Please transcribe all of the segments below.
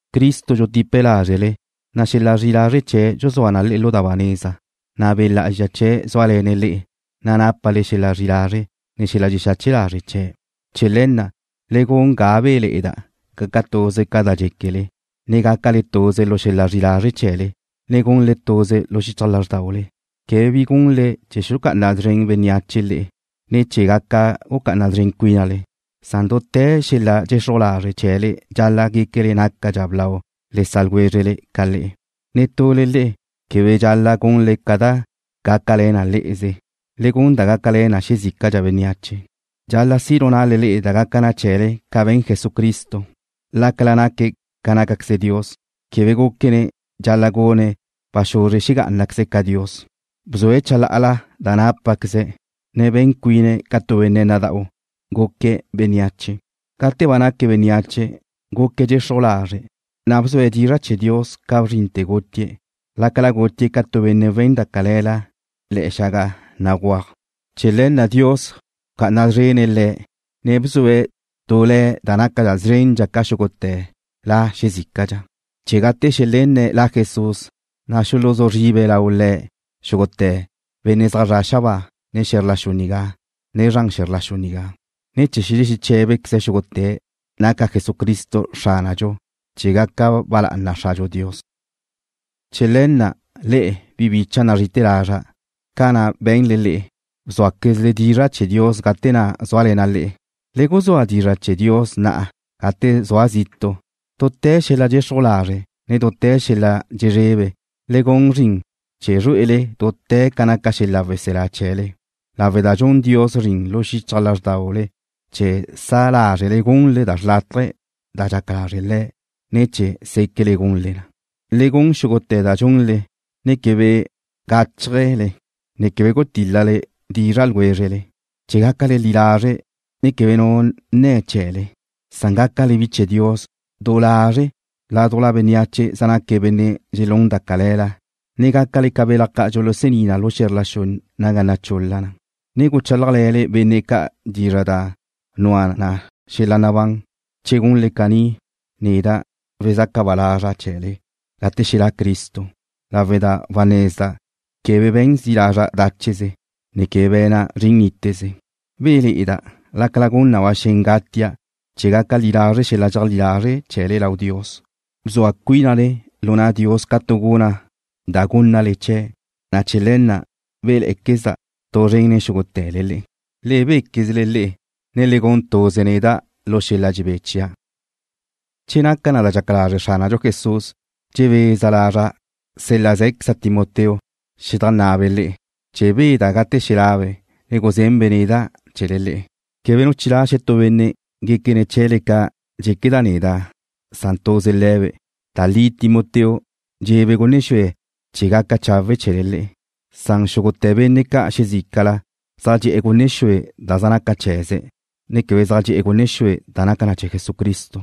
Cristo dxutipe̱' lázrele, na' xel-la zri'i lazre' chee̱' dxuzúa na le'e lu da ba neza, na' Be' Lá'azxa chee̱' zúale̱ne̱' le'e, na' nápale xel-la zri'i lazre', ne xel-la dxexache lazre' chee̱'. Chee̱ le̱ na' le gun ga béle̱'e̱da', gaca tuze ca da dxéquele, ne gácale tuze lu xel-la zri'i lazre' chee̱le, ne gunle tuze lu xichaj lázrdaule. Quebe bi gunle chee̱ xulucá'ana szren bénneache le'e, ne chee̱ gaca gucá'ana szren cuínale, san dute̱ xel-la dxexruj lazre' chee̱le dxal-la' guéquele nácadxa blau le sa' ljwézrele ca le'e. Netule le'e quebe dxal-la' gunle ca da gácale̱n le'eze. Le gun da gácale̱n na xezícadxa bénneache. Dxal-la' si' lu na'le da gaca na chee̱le ca be̱n Jesucristo. Lácala naque̱' ca nácaqueze Dios, quebe gúquene̱' dxal-la' gune̱' ba xuzre xegá'anaqueze̱' ca Dios. Bzue̱' chalá'ala da nápaqueze̱', ne be̱n cuine̱' ca tu benne' nada'u, guque̱' bénneache. Gate ba naque̱' bénneache, guque̱' dxexruj lazre', na' bzue̱' dizra' chee̱ Dios ca bzrinte̱ gutie̱', lácala gutie̱' ca tu benne' we̱n da cale̱la le̱'e̱ xaga béguaj. Chee̱ le̱ na' Dios bca'ana szrénle̱'e̱ Le̱', ne bzue̱' tu Le̱' da naca szrendxa ca xúgute̱ la xezícadxa, chee̱ gate xelenne̱' La Jesús, na' xuluzú zribe lau Le̱' xúgute̱ benne' zaj zre̱'e̱ xabáa, ne xe̱zr la xu nigá, ne zran xe̱zr la xu nigá, ne chee̱ xelexeche̱be xúgute̱' naca Jesucristo Xránadxu, chee̱ gaca ba lá'ana Xradxu Dios. Chee̱ le̱ na', le'e, bi bicha' nazri'ite̱ lazra', ca na' be̱nle le'e, bzúaquezle dizra' chee̱ Dios gate na' zúale̱na' le'e, le guzúadxa dizra' chee̱ Dios na'a gate zua' zitu'. Dute̱ xel-la dxexruj lazre', ne dute̱ xel-la dxezrebe le gun zrin chee̱ zrué'ele dute̱ ca naca xel-la weselá chee̱le, lawe' da dxun Dios zrin lu xichaj lázrdaule chee̱ sa lázrele gunle da xrlátaje da dxaca lazre' Le̱', ne chee̱ séquele gunle na. Le gun xúgute̱ da dxunle, ne quebe gáchajele, ne quebe gutil-la dizra' ljwézrele chee̱ gácale li lazre', ne quebe nu nne̱ chee̱le. Gácale bi chee̱ Dios du lazre' ládujla bénneache zaj naque̱' benne' dxelún da cale̱la, ne gácale ca belaj ca' dxulusení na lu xe̱zr la xu naga nachul-la na, ne guchálajle̱le benne' ca' dizra' da nua na xel-la nabán. Che gunle caní, neda' wezaca ba lazra' chee̱le gate xelá' Cristo, lawe' da wanezda' quebe be̱n zi' lazra' dácheze, ne quebe be̱na' zrin níteze. Béle̱'e̱da' lácala gun na ba xen gatia' chee̱ gaca li lazre' xel-la dxeajlí lazre' chee̱le lau Dios. Bzua cuínale lu na' Dios ca tu guna' da gúnnale chee̱', na' chee̱ le̱ na' béle̱'e̱quezda' tu zren nen xúgute̱le le'e. Le béquezle le'e, ne le gun tuze neda' lu xel-la dxebé chia'. Che naca da dxaca lazre' Xránadxu Jesús, dxebeza lazra' sél-laze̱queza' Timoteo xedajnná'abe' le'e, chee̱ beda' gate xelabe', ne guzenbe' neda' chee̱le le'e. Quebe nu chilá' xetú benne' guéquene̱' chee̱le ca da dxéqueda' neda'. Tuze Timoteo dxe'ebe' gunne xue chee̱ gaca chawe' chee̱le le'e. Xúgute̱ benne' ca' xezícala zaj dxe'e̱ gunne xue da zaj naca chee̱ze̱', ne quebe zaj dxe'e̱ gunne xue da naca chee̱ Jesucristo.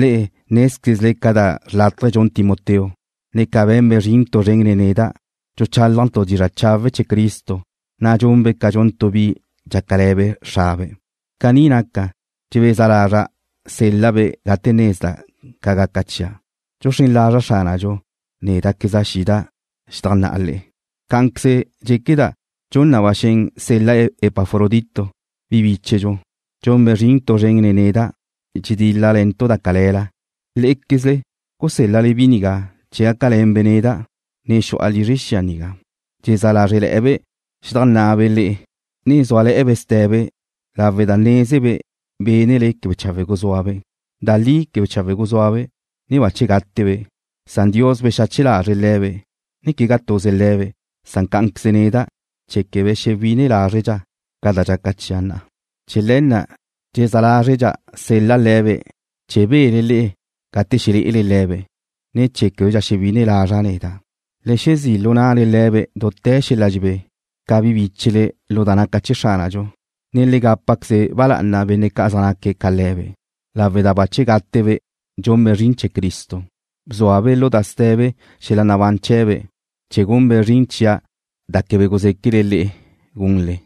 Le'e nézquezle ca da xrlátaje dxun Timoteo, ne ca be̱nbe' zrin tu zren nen neda'. Dxuchálajntu' dizra' chawe' chee̱ Cristo, na' dxunbe' ca dxun tu bi dxácale̱be' xrabe'. Caní naca, dxebeza lazra' sel-la'-be' gate nezda' ca gaca chia'. Dxuxrén lazra' Xránadxu, néda'queza' xida' xedajnná'a le'e. Cá'anqueze dxéqueda' dxun na ba xen sel-la' Epafrodito, bi bíchedxu. Dxunbe' zrin tu zren nen neda', dxedíl-lale̱ntu' da cale̱la. Lé'equezle gusél-lale bi nigá chee̱ gácale̱nbe' neda', ne xu'a lizre xia nigá. Dxezá lázrele̱'e̱be' xedajnna'abe' le'e, ne zúale̱'e̱be' ste̱be lawe' da nézebe' bénele quebe chawe' guzúabe'. Da li quebe chawe' guzúabe', ne bache gátebe', san Dios bexache lazre̱' le̱be', ne quegá tuze le̱be', cá'anqueze neda' chee̱ quebe xewine lázredxa' ca da dxaca chia' na'a. Chee̱ le̱ na' dxezá lázredxa' sel-la' le̱be' chee̱ bele le'e gate xelé'ele le̱be', ne chee̱ québedxa xewine lazra' neda'. Le xezí' lu na'le le̱be' dute̱ xel-la dxebé, ca bi bíchele lu da naca chee̱ Xránadxu, ne le gápaqueze ba lá'ana benne' ca' zaj naque̱' ca le̱be', lawe' da guzúa gátebe' dxunbe' zrin chee̱ Cristo. Bzuabe' lu da ste̱be xel-la nabán chee̱be' chee̱ gunbe' zrin chia' da quebe guzéquele le'e gunle.